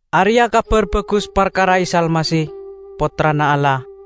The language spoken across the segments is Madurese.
Areya' Kabar Bagus parkara Isa Almasih, Pottrana Allah.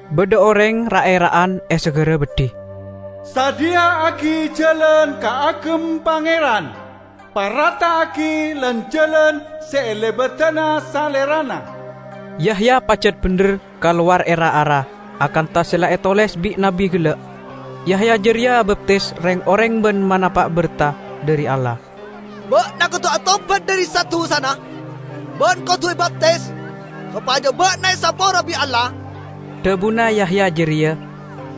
Badha oreng ra'-era'an e sagara beddhi, 'Sadhiya'agi jalan kaagem Pangeran; parata'agi lan-jalan se elebadana Salerana.' " Yahya pajat bendher kalowar e ra-ara, akantha se la etoles bi' nabbi gella'. Yahya jareya abaptis reng-oreng ban manapa' berta dhari Allah. "Ba'na kodu atobat dhari sa-dusana, ban kodu ebaptis, sopaja ba'na esapora bi' Allah," dhabuna Yahya jareya.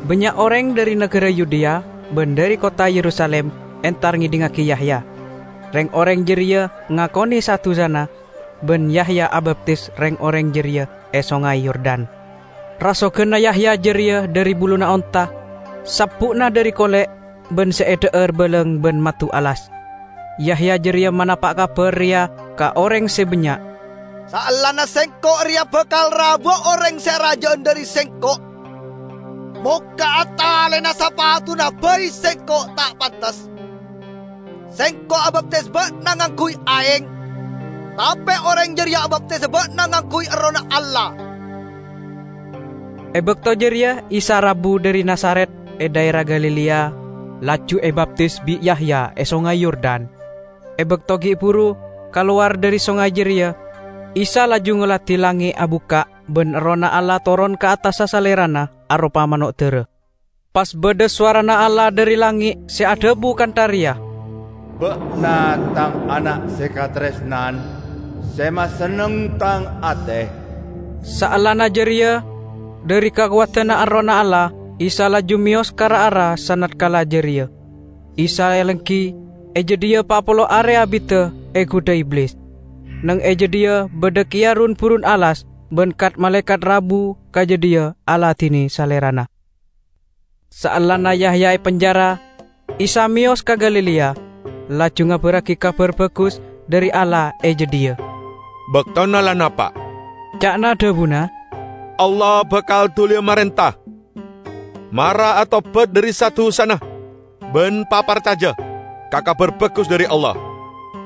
Bannya' oreng dhari nagara Yudea ban dhari kottha Yerusalim entar ngedhingngagi Yahya. Reng-oreng jareya ngakone sa-dusana, ban Yahya abaptis reng-oreng jareya e Songay Yordan. Rasoganna Yahya jareya dhari buluna onta. Sabbu'na dhari kole', ban se edha'ar balang ban maddu alas. Yahya jareya manapa' kabar reya ka oreng se bannya', "Saellana sengko' reya bakal rabuwa oreng se araja'an dhari sengko'. Mokka'a talena sapatuna bai sengko' ta' pantes. Sengko' abaptis ba'na ngangguy aeng, tape oreng jareya abaptisa ba'na ngangguy Errohna Allah." E bakto jareya Isa rabu dhari Nazaret e dhaera Galilea, laju ebaptis bi' Yahya e Songay Yordan. E bakto gi' buru kalowar dhari songay jareya, Isa laju ngoladi langnge' abukka' ban Errohna Allah toron ka attassa Salerana aropa mano' dara. Pas badha sowarana Allah dhari langnge' se adhabu kantha reya, "Ba'na Tang Ana' se kataresnan, se masenneng Tang ate." Saellana jareya dhari kakowadanna Errohna Allah Isa laju meyos ka ra-ara sanatkala jareya. Isa alenggi e jadhiya pa' polo are abidda, egudha Iblis. Neng e jadhiya badha keya run-burun alas, ban kat-malaekat rabu ka jadhiya aladine Salerana. Saellana Yahya epenjara, Isa meyos ka Galilea, laju ngabarragi Kabar Bagus dhari Allah e jadhiya. "Baktona la napa'," ca'na dhabuna, "Allah bakal duliya marenta. Mara atobat dhari sa-dusana, ban paparcaja ka Kabar Bagus dhari Allah!"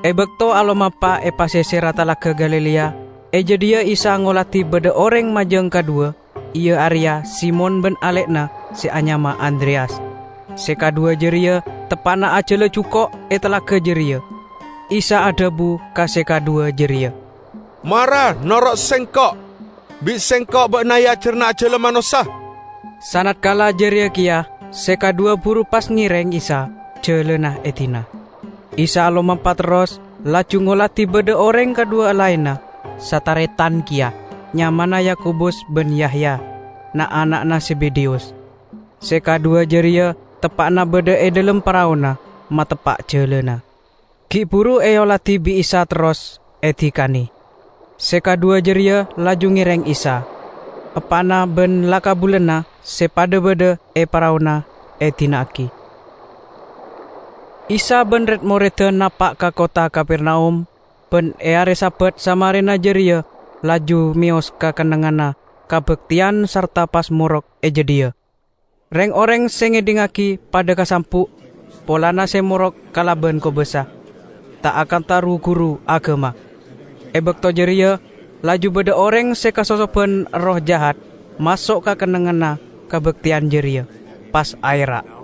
E bakto alomampa e paseserra Talaga Galilea, e jadhiya Isa ngoladi badha oreng majang kadhuwa, iya areya Simon ban ale'na se anyama Andreyas. Se kadhuwa jareya teppa'na ajala juko' e talaga jareya. Isa adhabu ka se kadhuwa jareya, "Mara noro' Sengko'. Bi' Sengko' ba'na eajarana ajala manossa." Sanatkala jareya keya se kadhuwa buru pas ngereng Isa, jalana edina. Isa alomampa terros, laju ngoladi badha oreng kadhuwa laenna, sataretan keya, nyamana Yakobus ban Yahya, na'-ana'na Zebedeyus. Se kadhuwa jareya teppa'na badha e dhalem paraona, mateppa' jalana. Gi' buru eoladi bi' Isa terros edikane. Se kadhuwa jareya laju ngereng Isa. Eppa'na ban la-kabulana se padha badha e paraona edina'agi. Isa ban red-moredda napa' ka kottha Kapernaum, ban e are Sabat samarena jareya laju meyos ka kennengnganna kabakteyan sarta pas morok e jadhiya. Reng-oreng se ngedhingngagi padha kasambu' polana se morok kalaban kobasa, ta' akantha ru-guru agama. E bakto jareya laju badha oreng se kasosoban erroh jahat maso' ka kennengnganna kabakteyan jareya, pas aera',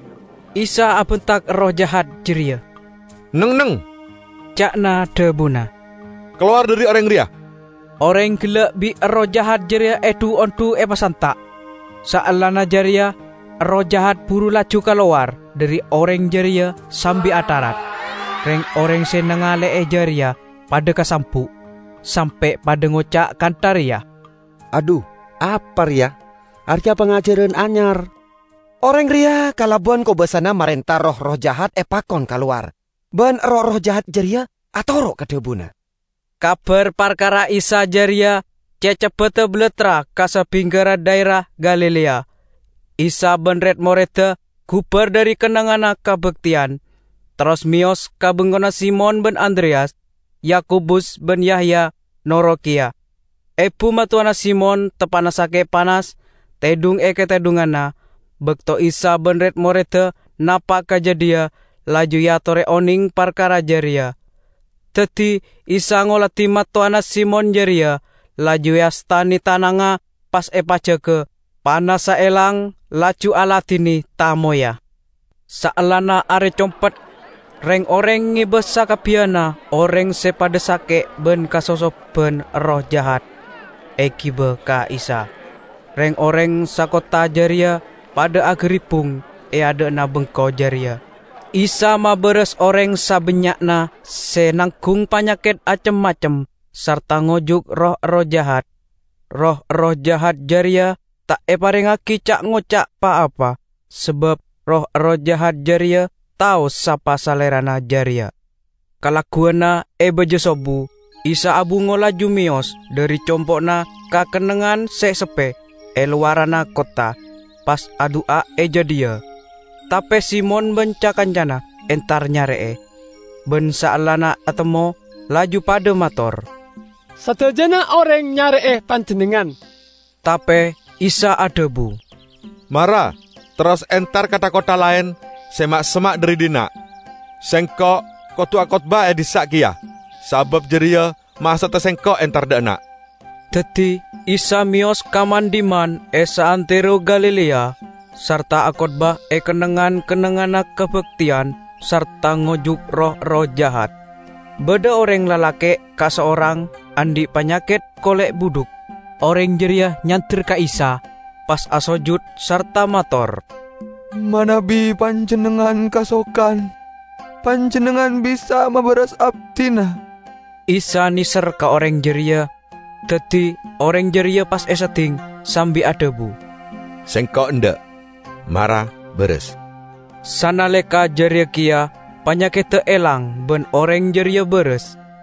Isa abentak erroh jahat jareya. "Neng-enneng!" ca'na dhabuna. "Kalowar dhari oreng reya!" Oreng gella' bi' erroh jahat jareya edhu-ondhu epasanta', saellana jareya erroh jahat buru laju kalowar dhari oreng jareya sambi atharat. Reng-oreng se nangale'e jareya padha kasambu', sampe' padha ngoca' kantha reya, "Adhu, apa reya? Areya pangajaran anyar! Oreng reya kalaban kobasana marenta roh-erroh jahat epakon kalowar, ban roh-erroh jahat jareya atoro' ka dhabuna!" Kabar parkara Isa jareya ce' ceppedda balattra ka sabingkerra dhaera Galilea. Isa ban red-moredda gubar dhari kennengnganna kabakteyan, terros meyos ka bengkona Simon ban Andreyas. Yakobus ban Yahya noro' keya. Ebu mattowana Simon teppa'na sake' panas, tedhung e katedhunganna. Bakto Isa ban red-moredda napa' ka jadhiya laju eatore oneng parkara jareya. Daddi Isa ngoladi mattowana Simon jareya, laju eastane tanangnga, pas epajaga. Panassa elang, laju aladine tamoyya. Saellana are compet, reng-oreng ngeba sakabbiyanna oreng se padha sake' ban kasosoban erroh jahat, egiba ka Isa. Reng-oreng sakottha jareya padha agaribbung e adha'na bengko jareya. Isa mabaras oreng sabannya'na se nanggung panyaket acem-macem sarta ngojuk roh-erroh jahat. Roh-erroh jahat jareya ta' eparengngagi ca'-ngoca' pa-apa, sabab roh-erroh jahat jareya tao sapa Salerana jareya. Kalagguwanna e baja sobbu, Isa abungo laju meyos dhari compo'na ka kennengngan se seppe e lowaranna kottha, pas adu'a e jadhiya. Tape Simon ban ca-kancana entar nyare'e. Ban saellana etemmo laju padha mator, "Sadajana oreng nyare'e Panjennengngan." Tape Isa adhabu, "Mara terros entar ka tha-kottha laen se ma'-semma' dhari dhinna'. Sengko' kodu akotbah e dhissa' keya, sabab jareya maksodda Sengko' entar dha' enna'." Daddi Isa meyos ka man-dhimman e saantero Galilea, sarta akotbah e kennengngan-kennengnganna kabakteyan sarta ngojuk roh-erroh jahat. Badha oreng lalake' kasorang andhi' panyaket kole' budhuk. Oreng jareya nyander ka Isa, pas asojud sarta mator, "Manabi Panjennengngan kasokan, Panjennengngan bisa mabaras abdina." Isa neser ka oreng jareya, daddi oreng jareya pas esedding sambi adhabu, "Sengko' endha'. Mara, baras!" Sanaleka jareya keya panyakedda elang ban oreng jareya baras.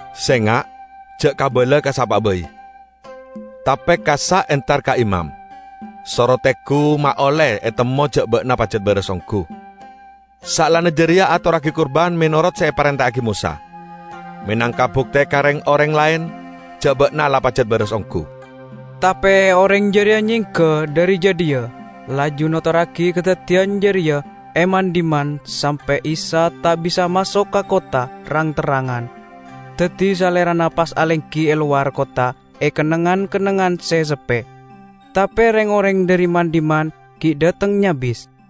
"Senga' ja' kabala ka sapa'a bai. Tape kassa' entar ka imam, soro tenggu ma' olle etemmo ja' ba'na pajat baras onggu. Saellana jareya, atorragi kurban menorot se eparenta'agi Mosa, menangka bukte ka reng-oreng laen ja' ba'na la pajat baras onggu." Tape oreng jareya nyengga dhari jadhiya, laju notorragi kadaddiyan jareya e man-dhimman sampe' Isa ta' bisa maso' ka kottha rang-terrangan. Daddi Salerana pas alenggi e lowar kottha e kennengngan-kennengngan se seppe. Tape reng-oreng dhari man-dhimman gi' dhateng nyabis.